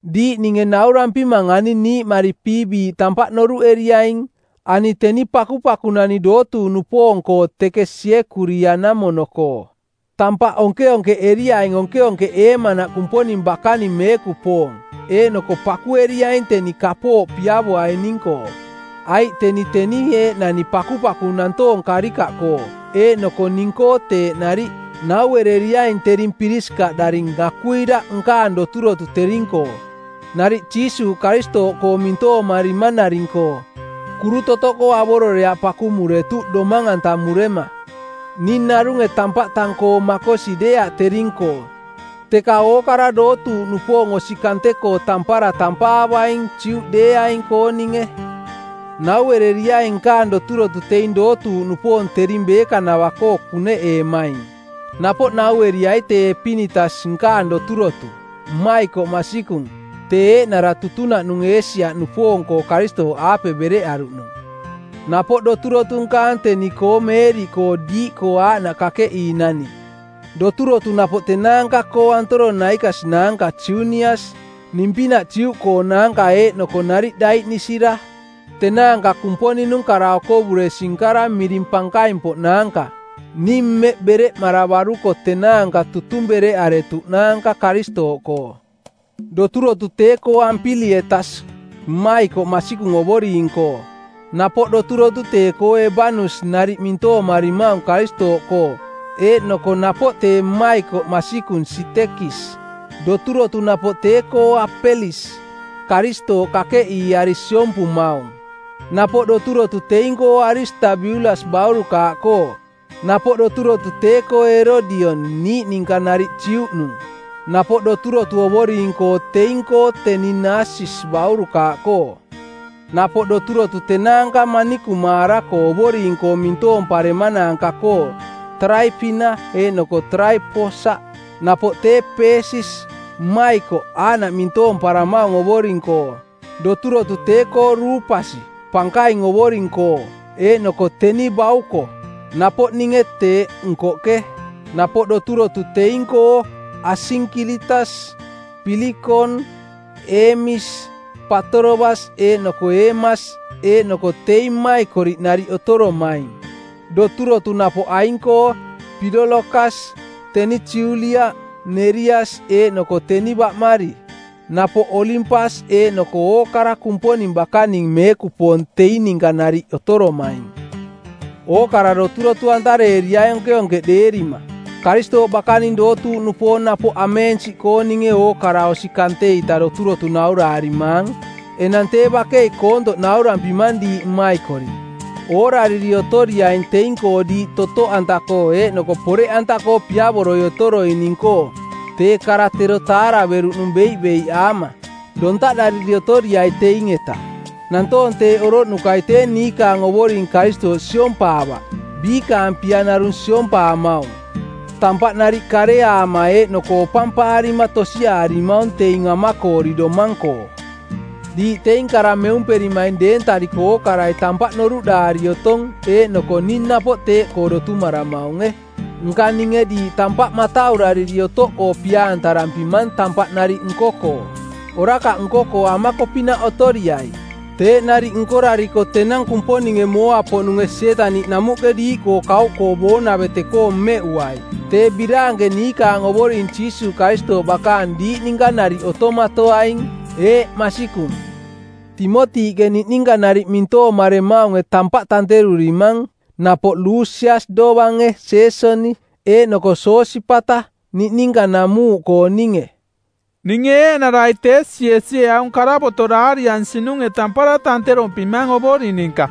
Diiꞌ ninge naurampimang ani niiꞌmari Piibiiꞌ tampaꞌ noruꞌeriaing. Ani teni pakupakunani dootuuꞌnupoong-koo teke Siekuria-namono-koo. Tampaꞌ onkeonkeꞌeriaing onkeonkeꞌeemanaꞌ Kumponing bakaning meekupoong, eeꞌnoko pakueriaing teni kapooꞌ piavoaining-koo, aiꞌ teni teni eeꞌnani pakupaku nantoong karikaꞌkoo, eeꞌnoko ning-koo teeꞌ nariꞌ. Nauereriaing tering Pirisikaꞌdaring Akuila nkaang doturotu tering-koo, nariꞌ Jiisuuꞌ Karistooꞌkoo mintoomarimanaring-koo. Kuru totoꞌkoo avororeaꞌ pakumuretuꞌ domang-antamurema. Ning narunge tampaꞌ tang-koo makosi deeaꞌ tering-koo teka ookara dootuuꞌnupoong osi kante-koo tampara tampaavaing, Juꞌdeeaing-kooninge. Nauereriaing nkaang doturotu teing dootuuꞌnupoong tering beekanavaꞌkoo kuneꞌeemaing. Napoꞌ naueriai tee Epinitas nkaang doturotu, mmaikoꞌ masikung, tee eeꞌnara tutunaꞌnung Eesia-nupoong-koo Karistooꞌaape bereꞌaruꞌnung. Napoꞌ doturotu nkaang teni-koo Meeriꞌkoo diiꞌkoo aaꞌnaꞌ kakeꞌiinani. Doturotu napoꞌ tenaanka-koo Antoronaikas naanka Junias, ning-pinaꞌ Juꞌkoonaanka eeꞌnoko nariꞌ daiꞌnisira. Tenaanka Kumponing-nung kara-okovuresi-nkara miring pankaing-poꞌnaanka. Ning mmeꞌ bereꞌmaravaruko tenaanka tutung bereꞌaretuꞌnaanka Karistooꞌkoo. Doturotu tee-koo Ampilietas, mmaikoꞌ masikung Ovoring-koo. Napoꞌ doturotu tee-koo Ebanus nariꞌ mintoomarimaung Karistooꞌkoo, eeꞌnoko napoꞌ tee mmaikoꞌ masikung Sitekis. Doturotu napoꞌ tee-koo Apelis, Karistooꞌ kakeꞌiiari siompumaung. Napoꞌ doturotu teing-koo Aristabiulas baurukaaꞌkoo. Napoꞌ doturotu tee-koo Erodion, niꞌninka nariꞌ Juꞌnung. Napoꞌ doturotu Ovoring-koo teing-koo teni Nasisis baurukaaꞌkoo. Napoꞌ doturotu tenaanka manikumaara-koo Ovoring-koo mintoomparemanaanka-koo Taraipina eeꞌnoko Taraiposaꞌ. Napoꞌ tee Peesis, mmaikoꞌ, aaꞌnaꞌ mintoomparamaung Ovoring-koo. Doturotu tee-koo Ruupasi, pankaing Ovoring-koo, eeꞌnoko teni bauko, napoꞌ ninge teeꞌ, nkoꞌke. Napoꞌ doturotu teing-koo Asinkiritas, Pilikon, Eemis, Patorobas eeꞌnoko Eemas eeꞌnoko teing mmaikoriꞌ nariꞌ otoromaing. Doturotu napoꞌ aing-koo: Pilolokasi, teni Julia, Nerias eeꞌnoko teni baꞌmari. Napoꞌ Olimpas eeꞌnoko ookara Kumponing bakaning meekupoong teing ninka nariꞌ otoromaing. Ookara doturotu-antareeriaing onkeonkeꞌdeerima. Karistooꞌ bakaning dootuuꞌnupoong napoꞌ ameensiꞌkooninge ookara osi kante-ita doturotu nauraarimaang. Enang tee bakei koontoꞌ naurampimang diiꞌ mmaikoriꞌ: Oorariri otoriaing teing-koo diiꞌ totoꞌanta-koo eeꞌnoko poreꞌanta-koo piavoroi otoroining-koo tee kara tero taaraveruꞌnung beiꞌbeiꞌaama. Dontaꞌdariri otoriai teing-eta. Nantoong teeꞌ oroꞌnukai tee niikaang Ovoring Karistooꞌ siompaavaꞌ, biikaang pia narung siompaamaung. Tampaꞌ nariꞌ kareaama eeꞌnoko opampaarima tosiaarimaung teing amakoori domang-koo. Diiꞌ teing kara meumperimaing deentariko ookarai tampaꞌ noruꞌdaari otong eeꞌnoko ning napoꞌ teeꞌkoo dotumaramaunge. Nka ninge diiꞌ tampaꞌ mataurariri otoꞌkoo pia-antarampimang tampaꞌ nariꞌ nko-koo. Orakaꞌ nko-koo amako-pinaꞌ otoriai. Teeꞌ nariꞌ nkorariko tenang Kumponinge mooa-poꞌnunge Sietaniꞌ namuꞌke diiꞌkoo kauꞌkoo boonavete-koo mmeꞌuai. Tee biraanke niikaang Ovoring Jiisuuꞌ Karistooꞌ bakaang diiꞌ ninka nariꞌ otomatoaing. Eeꞌ, masikung. Timotiꞌke niꞌninka nariꞌ mintoomaremaunge tampaꞌ tanterurimang, napoꞌ Lusias dovange Jeesoni eeꞌnoko Sosipata, niꞌninka namuuꞌkooninge. Ninge eeꞌnarai Tesiesie aung karavoto˜ daariansinunge tampara tanterompimang Ovoring ninka.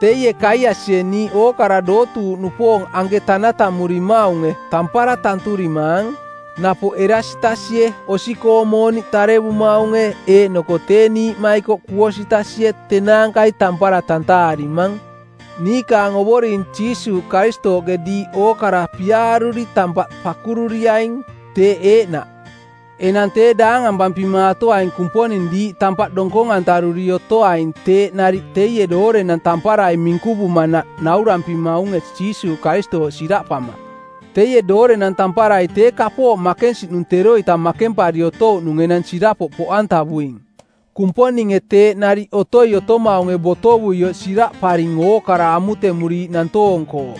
Teie Gaiasie niiꞌ ookara dootuuꞌnupoong anke tanatamurimaunge tampara tanturimaang. Napoꞌ Erasitasie osi-koong mooniꞌ tarevumaunge eeꞌnoko tee niiꞌmaikoꞌ Kuotasie tenaankai tampara tantaarimaang. Niikaang Ovoring Jiisuuꞌ Karistooꞌke diiꞌ ookara piaaruri tampaꞌ pakururiaing. Teeꞌ eeꞌnaꞌ. Enang tee daangampampimaatoaing Kumponing diiꞌ tampaꞌ donkong-antaruri otoaing teeꞌ nariꞌ teie doorenang tamparai minkuvumanaꞌ nauaramaunge Jiisuuꞌ Karistooꞌ siraꞌpama. Teie doorenang tamparai tee kapooꞌ makensiꞌnung teroita makempari otouꞌnung enang sirapoꞌ poꞌantavuing; Kumponinge teeꞌ nariꞌ otoi otomaunge botovuioꞌ siraꞌparing ookara amutemuriiꞌ nantoong-koo,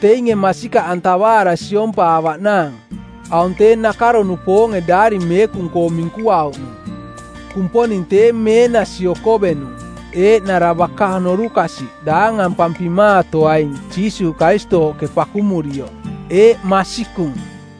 teinge masikaꞌantavaara siompaavaꞌnaang. Aung tee nakaro-nupoonge Daari Meekung-koo minkuauꞌnung. Kumponing tee meenasi okovenung, eeꞌnara baka norukasiꞌ daangampampimaatoaing Jiisuuꞌ Karistooꞌke pakumurioꞌ. Eeꞌ, masikung.